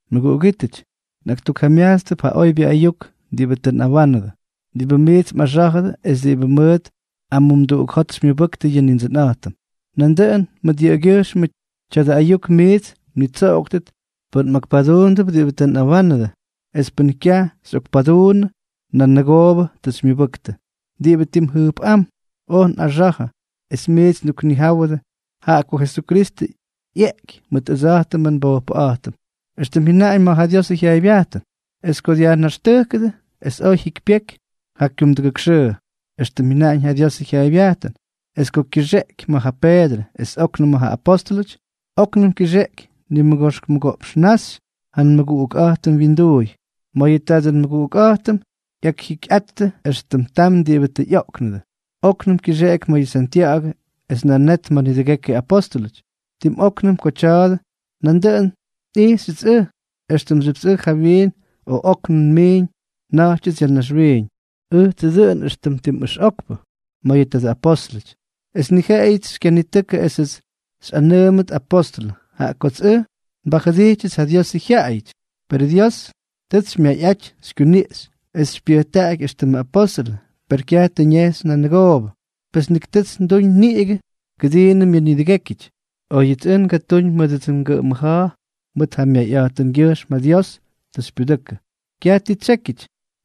Mʉguꞌugítʉty, nꞌaktukjamyajtstʉp ja oybyʉ ayuk diꞌibʉ tʉ nꞌawánʉdʉ, diꞌibʉ miits mꞌaxá̱jʉdʉ es diꞌibʉ mʉʉt amumduꞌuk xymyʉbʉktʉ yʉ Nindsʉnꞌa̱jtʉm. Nandʉꞌʉn mʉt yʉꞌʉgyʉjxmʉ tya̱dʉ ayuk miits mnitsoꞌoktʉt pʉn mꞌakpaduundʉp diꞌibʉ tʉ nꞌawánʉdʉ; es pʉn kyaj xyꞌokpaduunnʉ, nanʉgoobʉ tʉ xymyʉbʉktʉ. Diꞌibʉ tim jʉjpꞌám oj nꞌaxa̱jʉ es miits nduknijáwʉdʉ, jaꞌa ko Jesukristʉ ꞌyeꞌky mʉt ʉdsa̱jtʉmʉ nbojpʉꞌa̱jtʉm, éxtʉm jyʉnaꞌañ ma̱ ja Diosʉ jyaaybyajtʉn; es ko dyajnaxtʉjkʉdʉ, es ko jyikypyejky ja kyumdʉgʉk xʉʉ, éxtʉm jyʉnaꞌañ ja Diosʉ jyaaybyajtʉn, es ko kyʉxeꞌky ma̱ ja Peedrʉ es óknʉm ma̱ ja apóstʉlʉty, óknʉm kyʉxeꞌky nimʉgoxk mʉgoꞌpx naxy ja nmʉguꞌukꞌa̱jtʉm wyinduuy. Mayʉ tadʉ nmʉguꞌukꞌa̱jtʉm ꞌyakjikyꞌattʉ, es tam diꞌibʉ tʉ ꞌyoꞌknʉdʉ. Oknʉm kyʉxeꞌky ma̱ yʉ Santya̱ꞌa̱gʉ, es nan net ma̱ nidʉgekyʉ apóstʉlʉty. Tim óknʉm ko tya̱a̱dʉ, nandʉꞌʉn nꞌijxyʉts ʉj, éxtʉmxyʉpts ʉj jawyiin o óknʉm nmiiñ nja̱ꞌtyʉts ya̱ naxwiiñ. Ʉjtsʉ dʉꞌʉn éxtʉm tim ʉxꞌokpʉ ma̱ yʉ tadʉ apóstʉlʉty, es ni jeꞌeyʉts xykyanitʉkʉ esʉts xyꞌanʉʉmʉt apóstʉlʉ, jaꞌa kots ʉj nbajʉdijtyʉts yʉ Diosʉ jyaꞌayʉty. Perʉ Dios tʉts xymyayꞌaty xykyuniꞌxy esʉts xypyʉjtáky éxtʉmʉ apóstʉlʉ. Per kyaj tʉ ñejxy nanʉgoobʉ, pes nik tʉts nduñ niꞌigʉ kʉdiinʉm yʉꞌʉ nidʉgékyʉty; óyʉts oj ngatúñ mʉdʉdsʉ ngʉꞌʉm mʉja̱a̱, mʉt ja myayꞌa̱jtʉngyʉjxm ja Dios tʉ xypyudʉkʉ. Kyaj ti tsyékyʉty,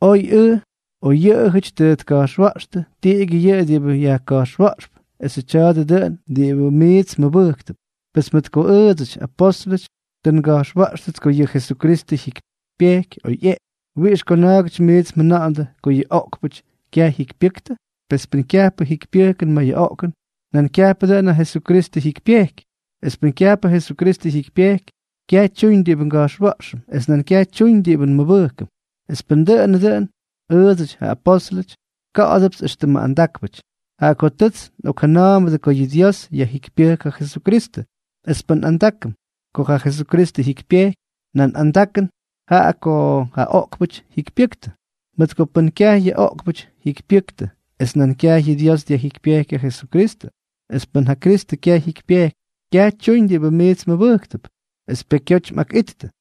oy ʉj o yʉꞌʉjʉty tʉ tka̱jxwa̱ꞌxtʉ, tiꞌigyʉ yʉꞌʉ diꞌibʉ yajka̱jxwa̱ꞌxp, esʉ tya̱a̱dʉ dʉꞌʉn diꞌibʉ miits mmʉbʉjktʉp. Pes mʉt ko ʉʉdsʉty, apóstʉlʉty, tʉ nga̱jxwa̱ꞌxtʉts ko yʉ Jesukristʉ jyikypyejky ko ꞌyeꞌky, ¿wiꞌix ko na̱a̱gʉty miits mjʉna̱ꞌa̱ndʉ ko yʉ oꞌkpʉty kyaj jyikypyʉktʉ? Pes pʉn kyajpʉ jikypyʉjkʉn ma̱ yʉ oꞌkʉn, nan kyajpʉ dʉꞌʉn ja Jesukristʉ jyikypyejky. Es pʉn kyajpʉ Jesukristʉ jyikypyejky, kyaj tyuñ diꞌibʉ nga̱jxwa̱ꞌxʉm, es nan kyaj tyuñ diꞌibʉ nmʉbʉjkʉm. Es pʉn dʉꞌʉnʉ dʉꞌʉn, ʉʉdsʉty, ja apóstʉlʉty, ka̱ꞌa̱dʉpts éxtʉmʉ andákpʉty, jaꞌa ko tʉts nꞌokjʉna̱a̱mbʉdʉ ko yʉ Dios yajjikypyʉjk ja Jesukristʉ; es pʉn andakʉn jaꞌa ko Kristʉ jyikypyejky, nan andakʉn jaꞌa ko ja oꞌkpʉty jyikypyʉktʉ, mʉt ko pʉn kyaj yʉ oꞌkpʉty jyikypyʉktʉ, pes nan kyaj yʉ Dios tʉ dyajjikypyéky ja Jesukristʉ. Es pʉn ja Kristʉ kyaj jyikypyejky, kyaj tyuñ diꞌibʉ miits mmʉbʉjktʉp, es pekyoty mꞌakꞌittʉ,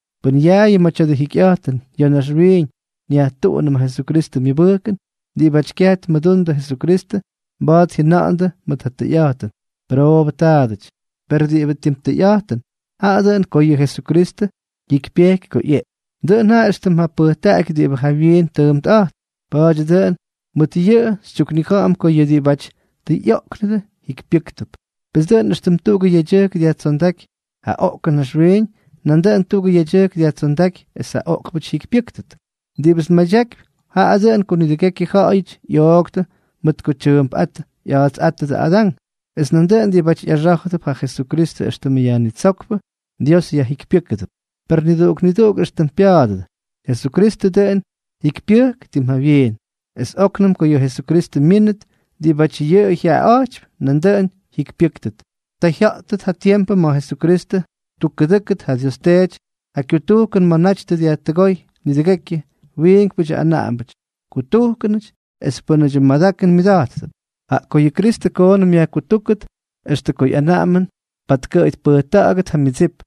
Pʉn yaayʉ ma̱ tya̱dʉ jikyꞌa̱jtʉn ya̱ naxwiiñ nyajtuꞌunʉm ja Jesukristʉ myʉbʉjkʉn, diꞌibáty kyaj tmʉdundʉ Jesukristʉ mba̱a̱t jyʉna̱ꞌa̱ndʉ mʉt ja tʉyꞌa̱jtʉn: “Pʉroobʉ taadʉty.” Per diꞌibʉ tim tʉyꞌa̱jtʉn, jaꞌa dʉꞌʉn ko yʉ Jesukristʉ jyikypyejky ko ꞌyeꞌky. Dʉꞌʉn jaꞌa éxtʉm ja pʉjtaꞌaky diꞌibʉ jawyiin tʉʉmpꞌa̱jtp. Pa̱a̱dyʉ dʉꞌʉn mʉt yʉꞌʉ xytyuknija̱ꞌa̱m ko yʉ diꞌibáty tʉ ꞌyoꞌknʉdʉ jikypyʉ́ktʉp. Pes dʉꞌʉn éxtʉm tuꞌugʉ yedyʉjk dyajtsondáky ja oꞌkʉn naxwiiñ, nandʉꞌʉn tuꞌugʉ yedyʉjk dyajtsondáky es ja oꞌkpʉty jyikypyʉ́ktʉt. Diꞌibʉts nmadyakypy, jaꞌa dʉꞌʉn ko nidʉgekyʉ ja̱ꞌa̱yʉty ꞌyooktʉ mʉt ko tyʉʉmpꞌát ꞌya̱a̱tsꞌátʉdʉ Adán, es nandʉꞌʉn diꞌibáty ꞌyaxá̱jʉdʉp ja Jesukristʉ éxtʉmʉ Yajnitsókpʉ, Dios yajjikypyʉ́kʉdʉp. Per niduꞌuk niduꞌuk éxtʉm pya̱a̱dʉdʉ: Jesukristʉ dʉꞌʉn jikypyʉjk tim jawyiin; es óknʉm ko yʉ Jesukristʉ myínʉt, diꞌibáty yʉꞌʉ jyaꞌaꞌa̱jtypy nandʉꞌʉn jyikypyʉ́ktʉt. Ta jya̱ꞌtʉt ja tiempʉ ma̱ ja Jesukristʉ ttukkʉꞌʉdʉ́kʉt ja Dios Teety ja kyutujkʉn ma̱ naty tʉ dyajkutʉgóy nidʉgekyʉ wiinkpʉdyʉ anaꞌambʉty, kutujkʉnʉty es pʉ́nʉdyʉ madakʉn myʉda̱jttʉp. Jaꞌa ko yʉ Kristʉ koonʉm yajkutúkʉt extʉ ko ꞌyanaꞌamʉn patkʉꞌʉy tpʉjta̱ꞌa̱gʉt ja myʉdsip.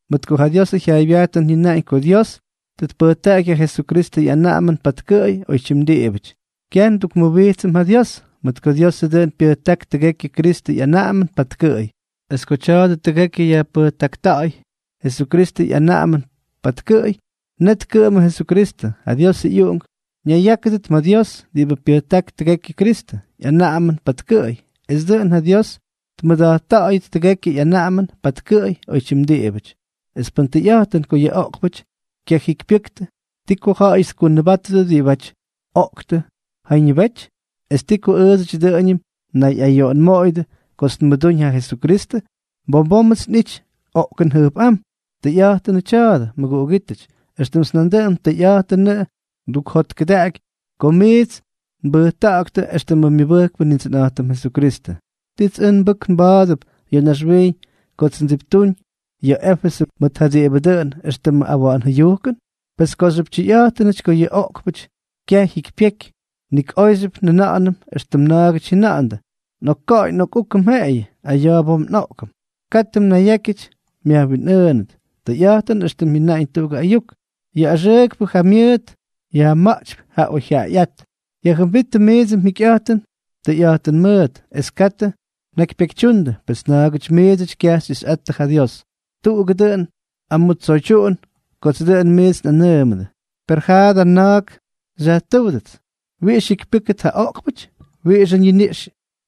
Mʉt ko ja Diosʉ jyaaybyajtʉn jyʉnaꞌañ ko Dios tʉ tpʉjtaꞌaky ja Jesukristʉ ꞌyanaꞌamʉn patkʉꞌʉy oytyim diꞌibʉty. Kyaj ndukmʉwijtsʉm ja Dios, mʉt ko Diosʉ dʉꞌʉn pyʉjták tʉgekyʉ Kristʉ ꞌyanaꞌamʉn patkʉꞌʉy. Es ko tya̱a̱dʉ tʉgekyʉ yajpʉjtakta̱a̱y Jesukristʉ ꞌyanaꞌamʉn patkʉꞌʉy, net kʉꞌʉmʉ Jesukristʉ, ja Diosʉ ꞌyUꞌunk, ñayyákʉdʉt ma̱ Dios, diꞌibʉ pyʉjtáky tʉgekyʉ Kristʉ ꞌyanaꞌamʉn patkʉꞌʉy, es dʉꞌʉn ja Dios tmʉda̱jtta̱ꞌa̱yʉt tʉgekyʉ ꞌyanaꞌamʉn patkʉꞌʉy oytyim diꞌibʉty. Es pʉn tʉyꞌa̱jtʉn ko yʉ oꞌkpʉty kyajikypyʉktʉ, ¿ti ko ja̱ꞌa̱yʉty tkunʉbátʉdʉ diꞌibáty oꞌktʉ jañʉbety? ¿Es ti ko ʉʉdsʉty dʉꞌʉñʉm nnayꞌayoꞌonmoꞌoyʉdʉ kots nmʉdúñ ja Jesukristʉ? Bom bómʉts nꞌity oꞌkʉn jʉjpꞌám. Tʉyꞌa̱jtʉnʉ tya̱a̱dʉ, mʉguꞌugítʉty, éxtʉmts nandʉꞌʉn tʉyꞌa̱jtʉnʉꞌʉ kots ndukjotkʉdaꞌaky kots miits nbʉjta̱ꞌa̱ktʉ éxtʉmʉ myʉbʉjkpʉ Nindsʉnꞌa̱jtʉm Jesukristʉ. ¿Tits ʉj nbʉk nba̱a̱dʉt ya̱ naxwiiñ kots ndsiptuuñ ya̱ Éfesʉ mʉt ja diꞌibʉ dʉꞌʉn éxtʉmʉ awa̱ꞌa̱n jʉyujkʉn? Pes kooxyʉp tyʉyꞌa̱jtʉnʉty ko yʉ oꞌkpʉty kyaj jyikypyeky, nik oyxyʉp njʉna̱ꞌa̱nʉm éxtʉm na̱a̱gʉty jyʉna̱ꞌa̱ndʉ: “Nꞌokka̱ꞌa̱y nꞌokꞌúkʉm jeꞌeyʉ. Aya̱ bom nꞌoꞌkʉm.” Katʉ mnayyákyʉty myajwinꞌʉʉnʉt. Tʉyꞌa̱jtʉn éxtʉm jyʉnaꞌañ tuꞌugʉ ayuk: “Yʉ axʉʉkpʉ jamyʉʉt yajma̱ꞌtypy ja oyjyaꞌayꞌát.” Yajjʉmbíttʉ miidsʉ mjikyꞌa̱jtʉn tʉyꞌa̱jtʉn mʉʉt, es katʉ mnakypyekytyundʉ, pes na̱a̱gʉty miidsʉty kyaj xyꞌixyꞌattʉ ja Dios. Tuꞌugʉ dʉꞌʉn amʉtsoydyuꞌun kodsʉ dʉꞌʉn miits nꞌanʉʉmʉdʉ. Per jaa da na̱a̱k xyajtʉ́wdʉts: “¿Wiꞌix jyikypyʉ́ktʉt ja oꞌkpʉty? ¿Wiꞌixʉ ñiniꞌx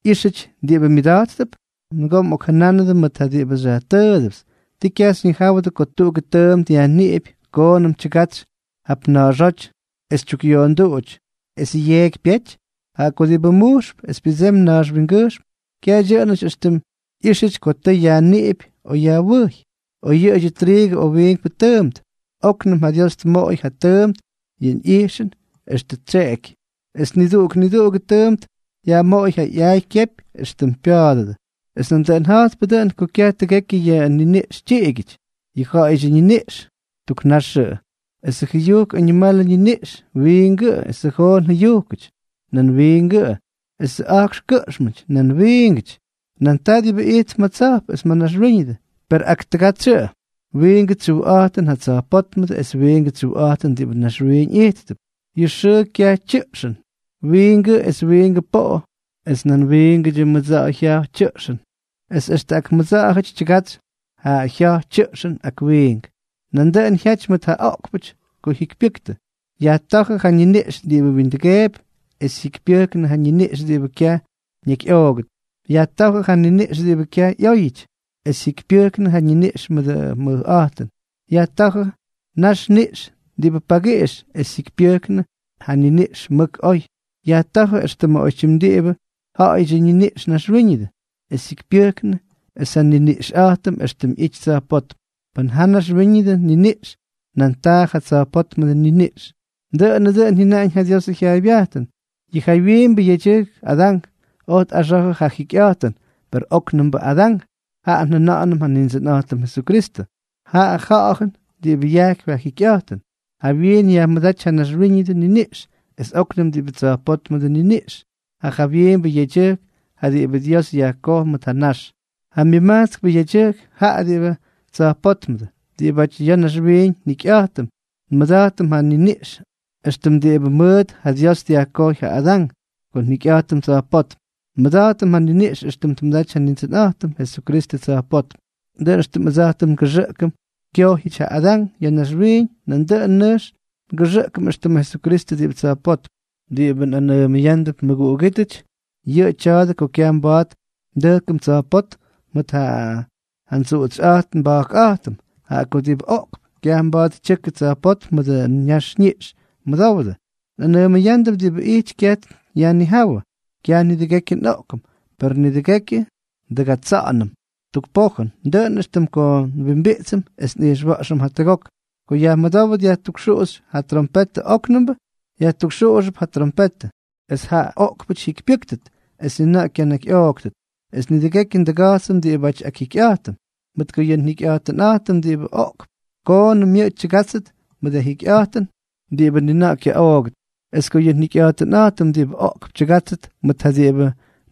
ꞌyíxyʉty diꞌibʉ myʉdáttʉp?” ¡Nʉgoo mꞌokkujuunꞌa̱jnʉdʉ mʉt ja diꞌibʉ xyajtʉʉdʉpts! ¿Tii kyaj xyñijáwʉdʉ ko tuꞌugʉ tʉʉmt yajniꞌipy, koonʉm tyʉgatsy jap na̱a̱xóty es tyukꞌyoonduꞌuty, es yeeky pyety? Jaꞌa ko diꞌibʉ mujxp es pyʉdsemy nax wingʉjxm, kyaj dyʉꞌʉnʉty éxtʉm ꞌyíxyʉty ko tʉ yajniꞌipy o yajwʉjy, oy yʉꞌʉdyʉ triigʉ o wiinkpʉ tʉʉmt. Oknʉm ja Dios tmoꞌoy ja tʉʉmp yʉ ꞌyijxʉn éxtʉm yʉꞌʉ ttseky, es niduꞌuk niduꞌugʉ tʉʉmp yajmoꞌoy ja ꞌyaay kyepy éxtʉm pya̱a̱dʉdʉ. Es nandʉꞌʉn ja̱jtpʉ dʉꞌʉn ko kyaj tʉgekyʉ yʉ niniꞌx tyiꞌigyʉty; yʉ ja̱ꞌa̱yʉdyʉ ñiniꞌx, tuk naxʉꞌʉ, esʉ jʉyujk añimalʉ ñiniꞌxʉty, wiingʉꞌʉ, esʉ joon jʉyujkʉty, nan wiingʉꞌʉ, esʉ a̱jkx kʉꞌxmʉty, nan wiingʉꞌʉ. Nan taa diꞌibʉ ijtp ma̱ tsa̱jp es ma̱ naxwíñʉdʉ, per ak tʉgatsyʉꞌʉ. Wiingʉ tsyujꞌa̱jtʉn ja tsa̱jpótmʉdʉ es wiingʉ tsyujꞌa̱jtʉn diꞌibʉ naxwiiñ ijttʉp. Yʉ xʉʉ jya̱j tyʉꞌxʉn, wiingʉꞌʉ, es wiingʉ poꞌo es nan wiingʉ mʉdsa̱ꞌa̱jʉdyʉ jya̱j tyʉꞌxʉn, es extʉ ak mʉdsa̱ꞌa̱jʉty tyʉgatsy ja jya̱j tyʉꞌxʉn ak wiink. Nandʉꞌʉn jyaty mʉt ja oꞌkpʉty ko jikypyʉktʉ. Yajtá̱jʉ ja naxniꞌx diꞌibʉ windʉgeepy, es jyikypyʉjknʉ ja niniꞌx diꞌibʉ kyaj ñakyꞌoogʉt. Yajtá̱jʉ ja naxniꞌx diꞌibʉ kyaj ꞌyóyʉty, es jyikypyʉjknʉ ja niniꞌx mʉdʉ mʉjꞌa̱jtʉn. Yajtá̱jʉ naxniꞌx diꞌibʉ pagiꞌix, es jyikypyʉjknʉ ja niniꞌx mʉk oy. Yajtá̱jʉ éxtʉmʉ oytyim diꞌibʉ ja̱ꞌa̱yʉdyʉ ñaxniꞌx naxwiiñʉdʉ, es jyikypyʉjknʉ ja niniꞌx éxtʉm ꞌyity tsa̱jpótm. Pʉn jaa ja naxwíñʉdʉ niniꞌx, nan taa ja tsa̱jpótmʉdʉ niniꞌx. Dʉꞌʉnʉ dʉꞌʉn jyʉnaꞌañ ja Diosʉ jyaaybyajtʉn: “Yʉ jawyiimbʉ yedyʉjk, Adán, oj tꞌaxa̱jʉ ja jikyꞌa̱jtʉn.” Per ja óknʉmbʉ Adán, jaꞌa njʉna̱ꞌa̱nʉm ja Nindsʉnꞌa̱jtʉm Jesukristʉ, jaꞌa Ja̱ꞌa̱jʉn diꞌibʉ yajkypy ja jikyꞌa̱jtʉn. Jawyiin yajmʉdáty ja naxwíñʉdʉ niniꞌx, es oknʉm diꞌibʉ tsa̱jpótmʉdʉ niniꞌx. Ja jawyiimbʉ yedyʉjk, jaꞌa diꞌibʉ Dios yajkoj mʉt ja nax; ja myʉmajtskpʉ yedyʉjk, jaꞌa diꞌibʉ tsa̱jpótmʉdʉ. Diꞌibáty ya̱ naxwiiñ njikyꞌa̱jtʉm, nmʉda̱jtʉm ja niniꞌx éxtʉm diꞌibʉ mʉʉt ja Dios dyajkojy ja Adán. Ko njikyꞌa̱jtʉm tsa̱jpótm, nmʉda̱jtʉm ja niniꞌx éxtʉm tmʉdaty ja Nindsʉnꞌa̱jtʉm Jesukristʉ tsa̱jpótm. Dʉꞌʉn éxtʉm ʉdsa̱jtʉm ngʉxʉꞌkʉm kyojyʉty ja Adán ya̱ naxwiiñ, nandʉꞌʉn nʉjx ngʉxʉꞌkʉm éxtʉmʉ Jesukristʉ diꞌibʉ tsa̱jpótm. Diꞌibʉ nꞌanʉʉmʉyándʉp mʉguꞌugítʉty, yʉꞌʉ tya̱a̱dʉ ko kyaj mba̱a̱t ndʉjkʉm tsa̱jpótm mʉt ja ndsuꞌutsyꞌa̱jt nba̱jkꞌa̱jtʉm. Jaꞌa ko diꞌibʉ oꞌkp, kyaj mba̱a̱t tyʉkʉ tsa̱jpótm mʉdʉ ñaxniꞌx. Mʉdowdʉ, nꞌanʉʉmʉyándʉp diꞌibʉ ijty kyaj yajnijáwʉ. Kyaj nidʉgekyʉ nꞌoꞌkʉm, per nidʉgekyʉ ndʉgatsa̱ꞌa̱yñʉm tuk pojʉn, dʉꞌʉn éxtʉm ko nwimbiꞌtsʉm es nꞌijxwa̱ꞌxʉm jatʉgok, ko yajmʉdówʉt yajtukxuꞌuxy ja trompetʉ óknʉmbʉ. Yajtukxuꞌuxʉp ja trompetʉ, es ja oꞌkpʉty jyikypyʉ́ktʉt, es ni na̱ꞌa̱ kyanakyꞌooktʉt, es nidʉgekyʉ ndʉga̱jtsʉm diꞌibáty akjikyꞌa̱jtʉm. Mʉt ko yʉ njikyꞌa̱jtʉnꞌa̱jtʉm diꞌibʉ oꞌkp, koonʉm yʉꞌʉ tyʉgátsʉt mʉt ja jikyꞌa̱jtʉn diꞌibʉ ni na̱ꞌa̱ kyaꞌoogʉt. Es ko yʉ njikyꞌa̱jtʉnꞌa̱jtʉm diꞌibʉ oꞌkp tyʉgátsʉt mʉt ja diꞌibʉ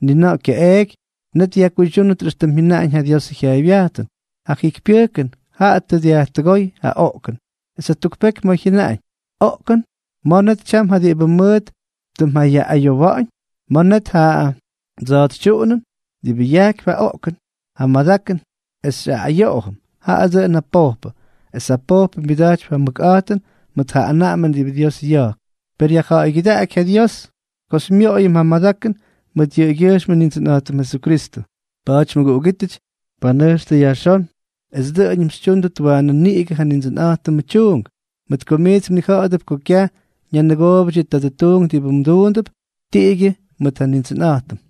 ni na̱ꞌa̱ kyaꞌeeky, net yajkuydyúnʉt éxtʉm jyʉnaꞌañ ja Diosʉ jyaaybyajtʉn: “Ja jikypyʉjkʉn jaꞌa tʉ dyajkutʉgóy ja oꞌkʉn.” Es jatuk peky ma̱ jyʉnaꞌañ: “Oꞌkʉn, ¿ma̱ net tyam ja diꞌibʉ mʉʉt tʉ mjayaꞌꞌayowa̱ꞌa̱ñ?, ¿ma̱ net ja mdsa̱a̱tsytyuꞌunʉn?” Diꞌibʉ yajkypy ja oꞌkʉn ja myadakʉn es xyaꞌꞌayoꞌom, jaꞌa dʉꞌʉn ja pojpʉ, es ja pojpʉ myʉda̱jtypy ja mʉkꞌa̱jtʉn mʉt ja anaꞌamʉn diꞌibʉ Dios ya̱jk. ¡Per yajja̱ꞌa̱ygyʉdaꞌaky ja Dios ko xymyoꞌoyʉm ja madakʉn mʉt yʉꞌʉgyʉjxm Nindsʉnꞌa̱jtʉm Jesukristʉ! Pa̱a̱ty mʉguꞌugítʉty, panʉjxtʉ yajxón es dʉꞌʉñʉm xytyúndʉt waanʉ niꞌigʉ ja Nindsʉnꞌa̱jtʉmʉ tyuunk, mʉt ko miits mnija̱ꞌa̱dʉp ko kyaj ñanʉgoobʉty yʉ tadʉ tuunk diꞌibʉ mduundʉp tiꞌigyʉ mʉt ja Nindsʉnꞌa̱jtʉm.